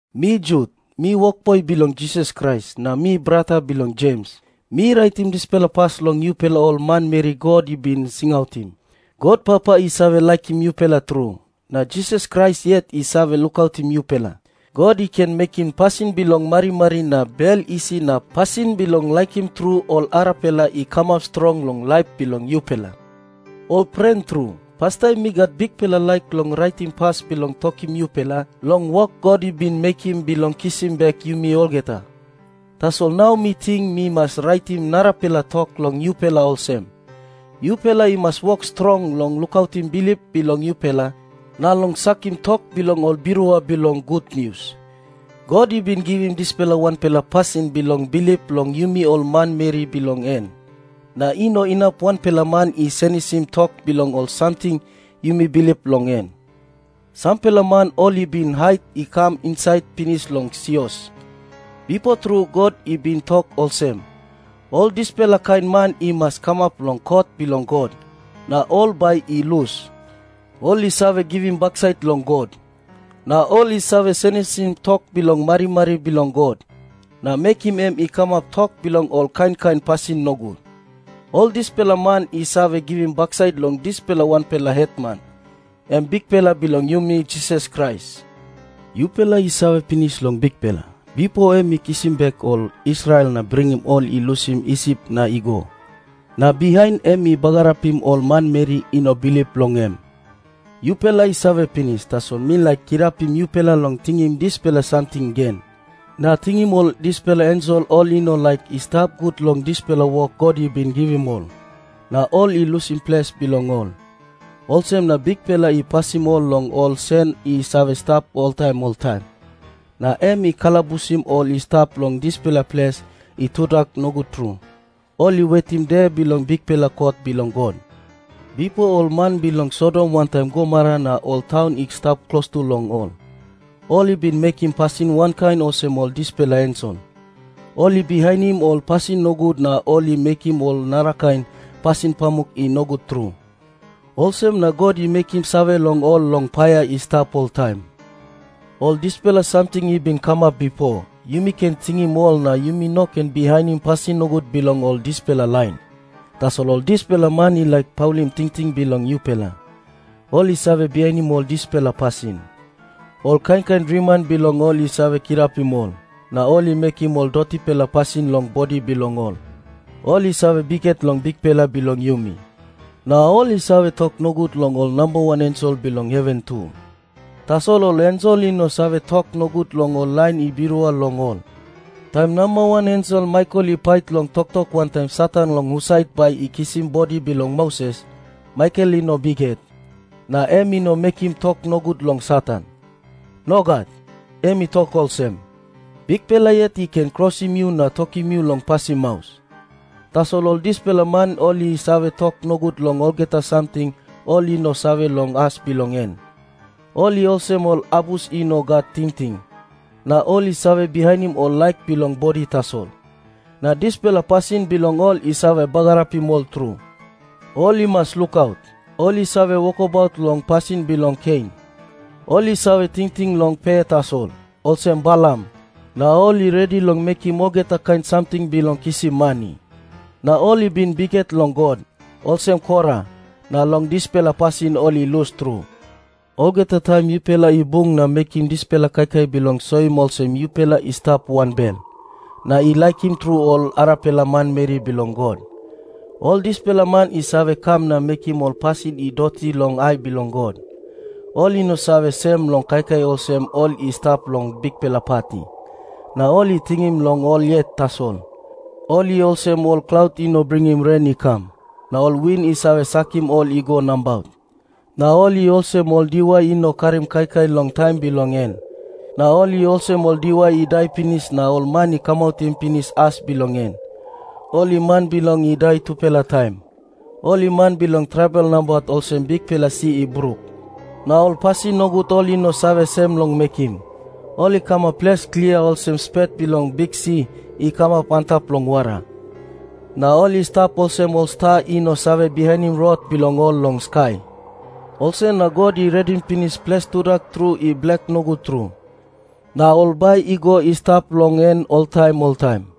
Mi Jut, mi wokboi bilong Jisas Krais, na mi brata bilong ems. Mi raitim dispela pas long yupela ol manmeri God i bin singautim. God Papa i save laikim yupela tru, na Jisas Krais yet i save lukautim yupela. God i ken mekim pasin bilong marimari na bel isi na pasin bilong laikim tru ol arapela i kamap strong long laip bilong yupela. Ol pren tru, pastaim mi gat bikpela laik long raitim pas bilong tokim yupela long wok God i bin mekim bilong kisim bek yumi olgeta. Tasol nau mi ting mi mas raitim narapela tok long yupela olsem, yupela i mas wok strong long lukautim bilip bilong yupela na long sakim tok bilong ol birua bilong gutnius. God i bin givim dispela wanpela pasin bilong bilip long yumi ol manmeri bilong en, na i no inap wanpela man i senisim tok bilong ol samting yumi bilip long en. Sampela man ol i bin hait i kam insait pinis long sios. Bipo tru God i bin tok olsem, ol dispela kain man i mas kamap long kot bilong God, na ol bai i lus. Ol i save givim baksait long God. Na ol i save senisim tok bilong marimari bilong God, na mekim em i kamap tok bilong ol kain kain pasin nogut. Ol dispela man i save givim baksait long dispela wanpela Hetman, em Bikpela bilong yumi Jisas Krais. Yupela i save pinis long Bikpela, bipo em i kisim bek ol Israel na bringim ol i lusim Isip na i go. Na bihain em i bagarapim ol manmeri i no bilip long em. Yupela i save pinis, tasol mi laik kirapim yupela long tingim dispela samting gen. Na tingim ol dispela ensel ol i no laik i stap gut long dispela wok God i bin givim ol, na ol i lusim ples bilong ol. Olsem na Bikpela i pasim ol long ol sen i save stap oltaim oltaim, na em i kalabusim ol i stap long dispela ples i tudak nogut tru. Ol i wetim De bilong bikpela kot bilong God. Bipo ol man bilong Sodom wantaim Gomora na ol taun i stap klostu long ol, ol i bin mekim pasin wankain olsem ol dispela ensel. Ol i bihainim ol pasin nogut na ol i mekim ol narakain pasin pamuk i nogut tru. Olsem na God i mekim save long ol long paia i stap oltaim. Ol dispela samting i bin kamap bipo, yumi ken tingim ol na yumi no ken bihainim pasin nogut bilong ol dispela lain. Tasol ol dispela man i laik paulim tingting bilong yupela, ol i save bihainim ol dispela pasin. Ol kain kain driman bilong ol i save kirapim ol na ol i mekim ol dotipela pasin long bodi bilong ol. Ol i save bikhet long Bikpela bilong yumi, na ol i save tok nogut long ol nambawan ensel bilong heven tu. Tasol ol ensel i no save tok nogut long ol lain i birua long ol. Taim namba wan ensel Maikel i pait long toktok wantaim Satan long husat bai i kisim bodi bilong Moses, Maikel i no bikhet, na em i no mekim tok nogut long Satan. Nogat. Em i tok olsem, “Bikpela yet i ken krosim yu na tokim yu long pasim maus.” Tasol ol dispela man ol i save tok nogut long olgeta samting ol i no save long as bilong en. Ol i olsem ol abus i no gat tingting, na ol i save bihainim ol laik bilong bodi tasol. Na dispela pasin bilong ol i save bagarapim ol tru. Ol i mas lukaut. Ol i save wokabaut long pasin bilong Kein. Ol i save tingting long pe tasol, olsem Balam, na ol i redi long mekim olgeta kain samting bilong kisim mani. Na ol i bin bikhet long God, olsem Kora, na long dispela pasin ol i lus tru. Olgeta taim yupela i bung na mekim dispela kaikai bilong soim olsem yupela i stap wanbel na i laikim tru ol arapela manmeri bilong God, ol dispela man i save kam na mekim ol pasin i doti long ai bilong God. Ol i no save sem long kaikai olsem ol i stap long bikpela pati, na ol i tingting long ol yet tasol. Ol i olsem ol klaut i no bringim ren i kam, na ol win i save sakim ol i go nabaut. Na ol i olsem ol diwai i no karim kaikai long taim bilong en. Na ol i olsem ol diwai i dai pinis na ol man i kamautim pinis as bilong en. Ol i man bilong i dai tupela taim. Ol i man bilong trabel nabaut, olsem bikpela si i bruk. Na ol pasin nogut ol i no save sem long mekim, ol i kamap ples klia olsem spet bilong biksi i kamap antap long wara. Na ol i stap olsem ol sta i no save bihainim rot bilong ol long skai. Olsem na God i redim pinis ples tudak tru i blak nogut tru, na ol bai i go i stap long en oltaim oltaim.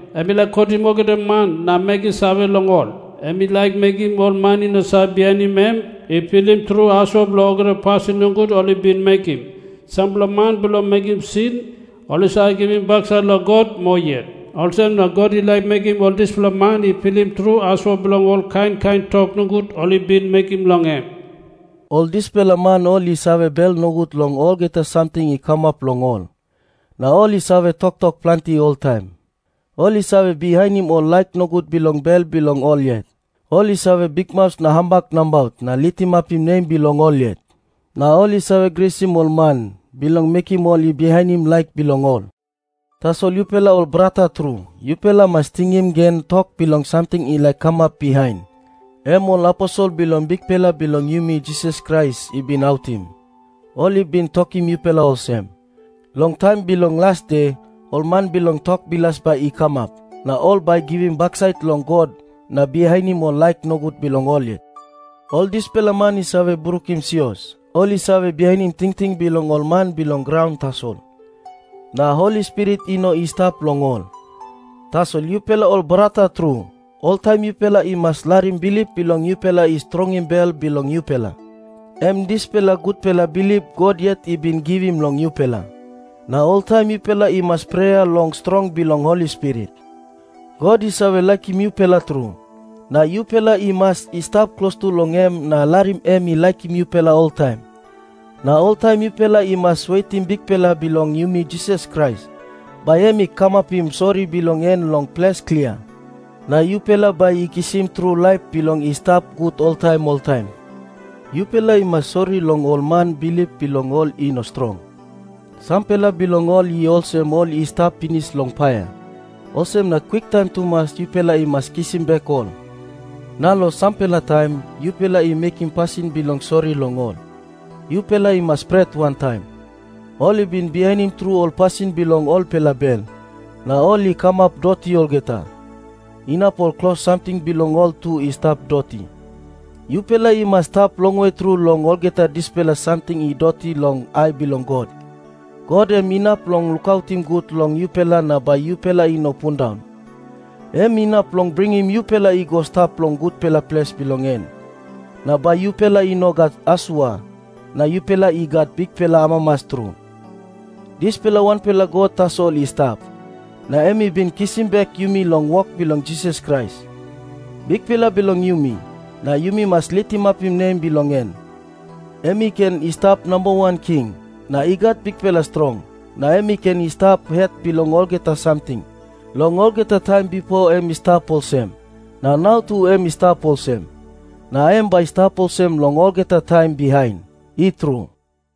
Em i laik kotim olgeta man na mekim save long ol. Em i laik mekim ol man i no save bihainim em i pilim tru asua bilong olgeta pasin nogut ol i bin mekim. Sampela man bilong mekim sin, ol i save givim baksait long God moa yet. Olsem na God i laik mekim ol dispela man i pilim tru asua bilong ol kain kain tok nogut ol i bin mekim long em.” Ol dispela man ol i save bel nogut long olgeta samting i kamap long ol, na ol i save toktok planti oltaim. Ol i save bihainim ol laik nogut bilong bel bilong ol yet. Ol i save bikmaus na hambak nabaut na litimapim nem bilong ol yet. Na ol i save grisim ol man, bilong mekim ol i bihainim laik bilong ol. Tasol yupela ol brata tru, yupela i mas tingim gen tok bilong samting i laik kamap bihain, em ol aposel bilong Bikpela bilong yumi Jisas Krais, i bin autim. Ol i bin tokim yupela olsem, “Long taim bilong las de, ol man bilong tok bilas bai i kamap, na ol bai i givim baksait long God na bihainim ol laik nogut bilong ol yet.” Ol dispela man i save brukim sios. Ol i save bihainim tingting bilong ol man bilong graun tasol, na Holi Spirit i no i stap long ol. Tasol yupela ol brata tru, oltaim yupela i mas larim bilip bilong yupela i strongim bel bilong yupela, em dispela gutpela bilip God yet i bin givim long yupela. Na oltaim yupela i mas prea long strong bilong Holi Spirit. God i save laikim yupela tru, na yupela i mas i stap klostu long em na larim em i laikim yupela oltaim. Na oltaim yupela i mas wetim Bikpela bilong yumi Jisas Krais, bai em i kamapim sori bilong en long ples klia, na yupela bai i kisim tru laip bilong i stap gut oltaim oltaim. Yupela i mas sori long ol man bilip bilong ol i no strong. Sampela bilong ol i olsem ol i stap pinis long paia, olsem na kwiktaim tumas yupela i mas kisim bek ol. Na long sampela, taim yupela i mekim pasin bilong sori long ol, yupela i mas pret wantaim. Ol i bin bihainim tru ol pasin bilong olpela bel, na ol i kamap doti olgeta, inap ol klos samting bilong ol tu i stap doti. Yupela i mas stap longwe tru long olgeta dispela samting i doti long ai bilong God. God em inap long lukaut gut long yupela na bai yupela i no pundaun. Em inap long bringim yupela i go i stap long gutpela ples bilong en, na bai yupela i no gat asua, na yupela i gat bikpela amamas tru. Dispela wanpela God tasol i stap, na em i bin kisim bek yumi long wok bilong Jisas Krais, Bikpela bilong yumi, na yumi mas litimapim nem bilong en. Em i ken i stap namba wan king, na i gat bikpela strong, na em i ken i stap het bilong olgeta samting. Long olgeta taim bipo em i stap olsem, na nau tu em i stap olsem. Na em bai i stap olsem long olgeta taim bihain. I tru.